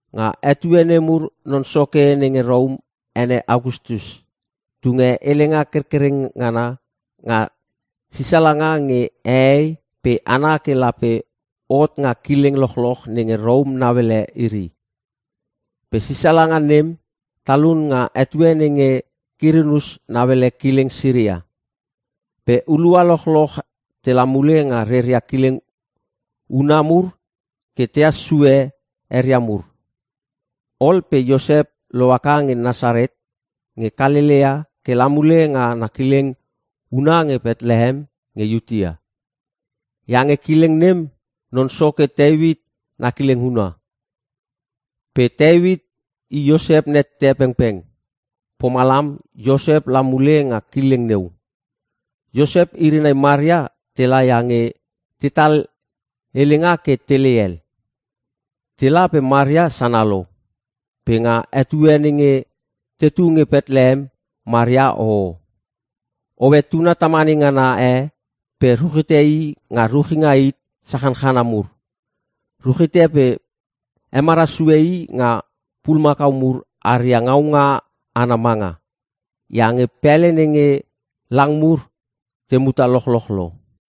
Nga etue nemur non soke nenge Rom ene Agastus tunge helenga kerkerengana nga sisalanga nge hehei pe hana ke lape hot nga kileng lochloch nenge Rom nauele iri. Pe sisalanga nem talun nga etue nenge Kirinius nauele kileng Siria. Pe hulua lochloch tela mule nga reria kileng una mur ke tehas sue eria mur. Ol pe Iosep lohaka nge Nasaret nge Kalelea ke la mule nga na kileng una nge Petlehem nge Iutea. Iange kileng nem non soke Teuit na kileng huna. Pe Teuit i Iosep nette pengpeng. Pomalam Iosep la mule nga kileng neu. Iosep iri nai Maria tela iange tetal helenga ke telei hel. Tela pe Maria sana lo. Pe nga etue nenge tetu nge Petlehem Maria hoho. Hoe tuna tamane ngana e pe ruchite i nga ruchinga hit sachanchana mur. Ruchite pe hemara sue i nga pulumakau mur aria ngaunga ana manga. Iange pele nenge lang mur te muta lochloch lo.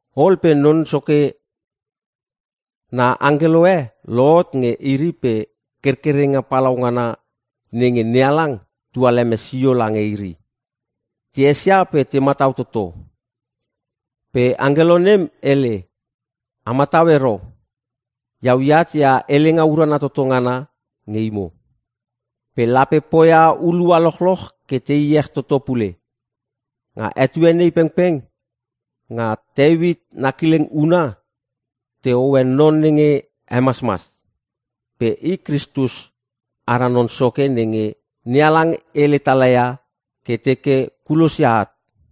Ol pe Non Soke na angkelo e lohot nge iri pe kerkerenga palau ngana nenge NeHalang tualeme sio lange iri. Te esia pe te matau toto. Pe angkelo nem hele, “A matau ero! Iau eat ia helenga urana toto ngana nge imo, pe lape poia hulua lochloch ke te iech toto pule. Nga etue nei pengpeng nga Teuit na kileng huna te hoe non nenge hemasmas. Pe i Kristus, ara Non Soke nenge NeHalang hele tala ia ke teke kulosia at.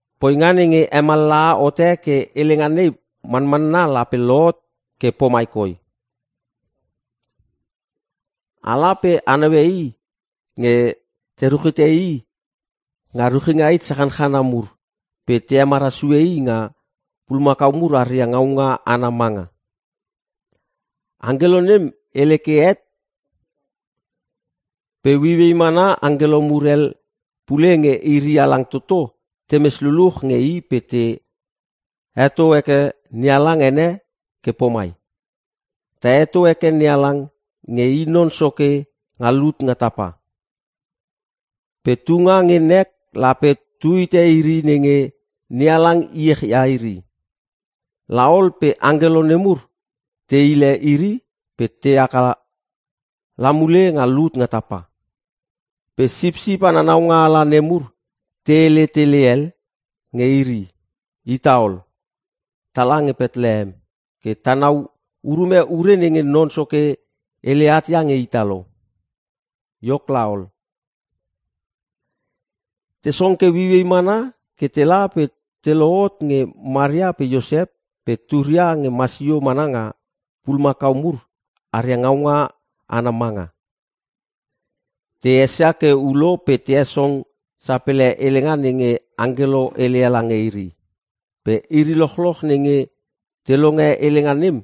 Poinga nenge hemallaha hote ke helenga nei manmanna lape lohot ke pomai koi; ala pe a naue i nge te ruchite i nga ruchinga hit sachanchana mur pe te hemara sue i nga pulumakau mur aria ngaunga ana manga.” Angkelo nem hele ke het pe ueiuei mana angkelo mur hel pule nge iri halang toto temes luluch nge i pe te heto heke NeHalang ene ke pomai: “Ta heto heke NeHalang nge i Non Soke nga lut nga tapa. Pe tunga nge nek lape tu hite iri nenge NeHalang iech ia iri!” La ol pe angkelo nemur te hile iri pe te haka la mule nga lut nga tapa. Pe sipsip ana naungaala nemur te hele tele hel nge iri, “Ita ol! Tala nge Petlehem ke tanau urume ure nenge Non Soke hele at nge ita lo!” Iok laol, te song ke ueiuei mana ke tela pe te lohot nge Maria pe Iosep pe turia nge masio mana nga pulumakau mur aria ngaunga ana manga. Te esia ke ulo pe te hesong sapele helenga nenge angkelo heleia lange iri. Pe iri lochloch nenge te longe helenga nem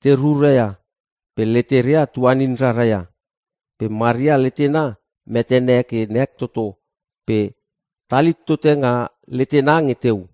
te rura ia pe leteria tuanin rara ia. Pe Maria letena metene ke nek toto pe talhit tote nga letena nge teu.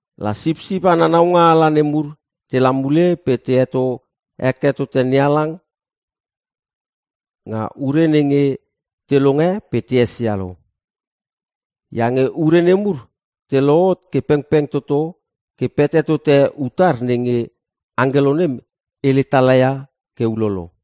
La sipsip ana naungaala nemur tela mule pe te heto heke tote NeHalang, nga ure nenge te longe pe te esia lo. Iange ure nemur te lohot ke pengpeng toto ke pete tote utar nenge angkelo nem hele tala ia ke ulolo.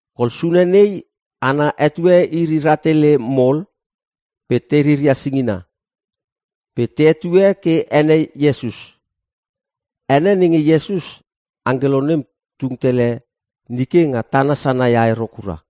Kol sune nei ana etue iri rahtele mol pe te riria singina. Pe te hetue ke ene Iesus. Ene nenge Iesus, angkelo nem tung tele nike nga tana sanaia i ero kura.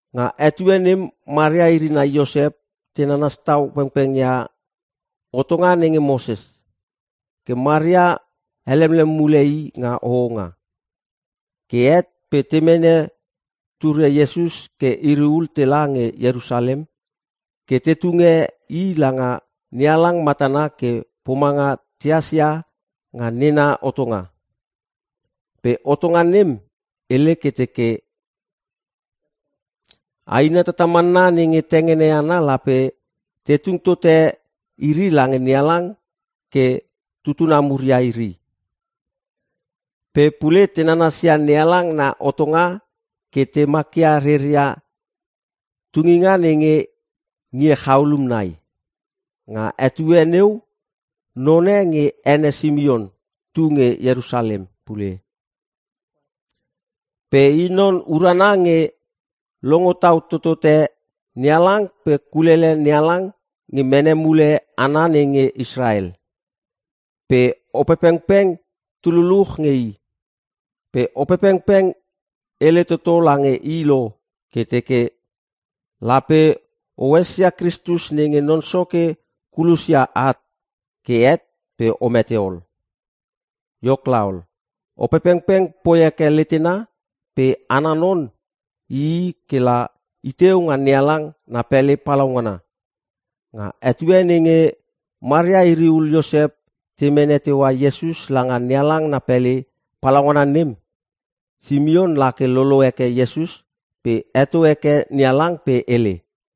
Nga etue nem Maria iri nai Iosep te nanas tau pengpeng ia hotonga nenge Moses. Ke Maria helemlem mule i nga hohonga. Ke het pe te mene turia Iesus ke iri ul tela nge Ierusalem ke te tunge i langa NeHalang matana ke pomanga tehas ia nga nena hotonga. Pe hotonga nem hele ke teke, “Aina tatamanna nenge tengene ana lape te tung tote iri lange NeHalang ke tutuna mur ia iri.” Pe pule te nanasia NeHalang na hotonga ke te makia reria tunginga nenge ngie chaulum nai. Nga etue neu none nge ene Simion tu nge Ierusalem pule. Pe i non urana nge longo tau totote NeHalang pe kulele NeHalang nge mene mule hana nenge Israel. Pe Opepengpeng tu luluch nge i. Pe Opepengpeng hele toto lange i lo ke teke, “Lape o esia Kristus nenge Non Soke kulosia at, ke het pe o mete ol.” Iok laol, Opepengpeng poi heke letena pe ana non ii ke la iteu nga NeHalang na pele palaungana. Nga etue nenge Maria iri ul Iosep te mene teua Iesus langa NeHalang na pele palaungana nem Simion lake lolo heke Iesus pe heto heke NeHalang pe hele;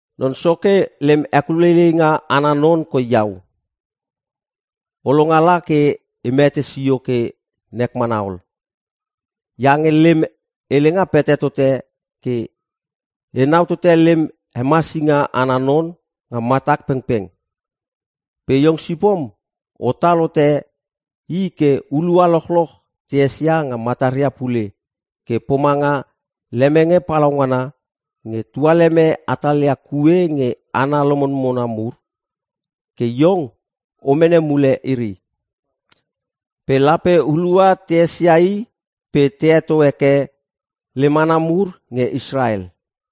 “Non Soke lem hekuleileinga ana non koi iau. O longala ke e mete sio ke nek mana ol. Iange lem helenga pete tote ke enau tote lem hemasinga ana non nga matak pengpeng. Pe iong sipom otal hote i ke hulua lochloch te esia nga mataria pule ke pomanga lemenge palaungana nge tualeme hatalia kue nge hana lomona mur ke iong o mene mule iri. Pe lape hulua te esia i pe te heto heke lem hana mur nge Israel.”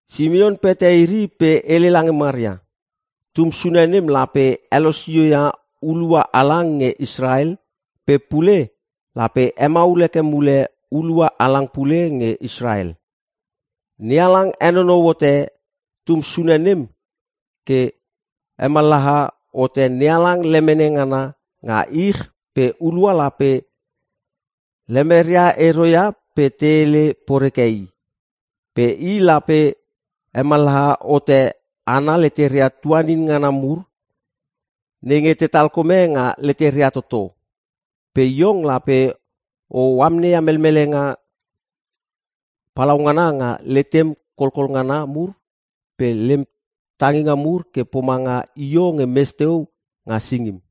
Simion pete iri pe hele lange Maria, “Tum sune nem lape helosio ia hulua halang nge Israel pe pule lape hemaul heke mule hulua halang pule nge Israel. NeHalang henonou hote tum sune nem ke hemallaha hote NeHalang lemene ngana nga ich pe hulua lape lemeria ero ia pe te hele poreke i. Pe i lape hemallaha hote hana leteria tuanin ngana mur nenge te talkome nga leteria toto. Pe iong lape o amneia melmelenga palaungana nga letem kolkol ngana mur pe lem tanginga mur ke pomanga io nge mes teu nga singim.”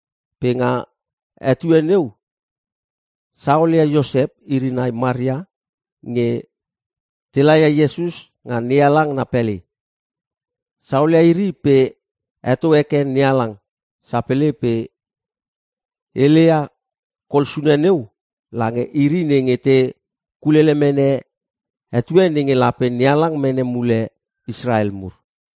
Pe nga etue neu saolia Iosep iri nai Maria nge te laia Iesus nga NeHalang na pele. Saolia iri pe heto heke NeHalang sapele pe heleia kol sune neu lange iri nenge te kulele mene etue nenge lape NeHalang mene mule Israel mur.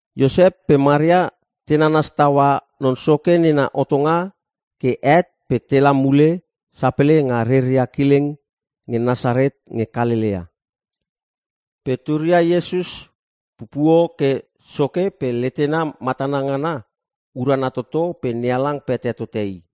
Iosep pe Maria te nanas taua Non Soke nena hotonga ke het pe tela mule sapele nga reria kileng nge Nasaret nge Kalelea. Pe turia Iesus pupuo ke soke pe letena matana ngana urana toto pe NeHalang pete tote i.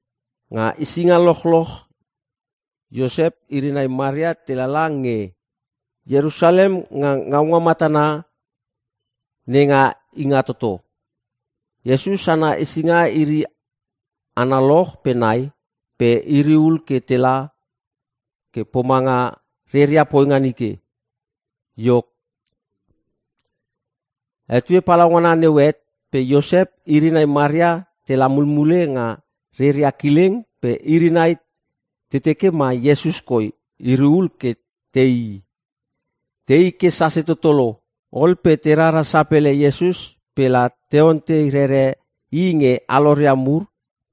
Nga hesinga lochloch Iosep iri nai Maria telala nge Ierusalem nga ngaunga matana nenga Ingatoto. Iesus ana hesinga iri analoch pe nai pe iri ul ke tela ke pomanga reria poinga nike. Iok, etue palaungana neu het pe Iosep iri nai Maria tela mulmule nga reria kileng pe iri nai te teke ma Iesus koi iri ul ke teii. Teii ke sase toto lo, ol pe te rara sapele Iesus pe la te ontei rere i nge aloria mur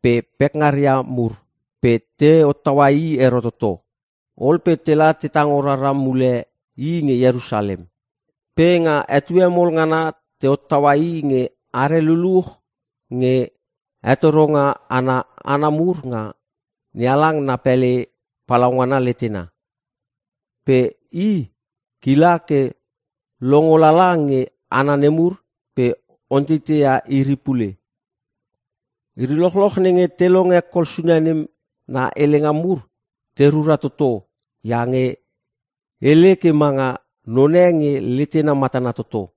pe pekngaria mur. Pe te hottaua i ero toto. Ol pe tela te tango rara mule i nge Ierusalem. Pe nga etue mol ngana te hottaua i nge are luluch nge hetoronga ana hana mur nga NeHalang na pele palaungana letena. Pe i kila ke longo lala nge hana nemur pe onteiteia iri pule. Iri lochloch nenge te longe Kol sune nem na helenga mur te rura toto iange hele ke manga none nge letena matana toto.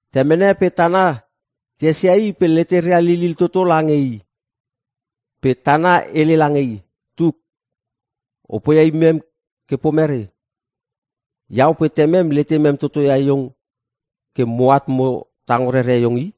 Temene pe tana te esia i pe leteria lilil toto lange i. Pe tana hele lange i, “Tuk, o poia imem ke pomere? Iau pe temem letemem toto ia iong ke moat mo tango rere iong i!”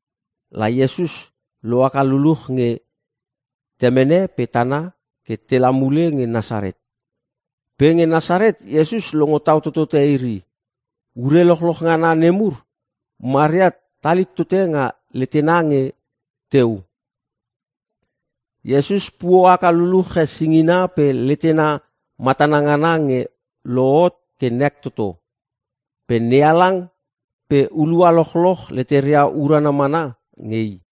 La Iesus lohaka luluch nge temene pe tana ke tela mule nge Nasaret. Pe nge Nasaret Iesus longo tau totote iri. Ure lochloch ngana nemur Maria talhit tote nga letena nge teu. Iesus puo haka luluche singina pe letena matana ngana nge lohot ke nek toto. Pe NeHalang pe hulua lochloch leteria urana mana nge i.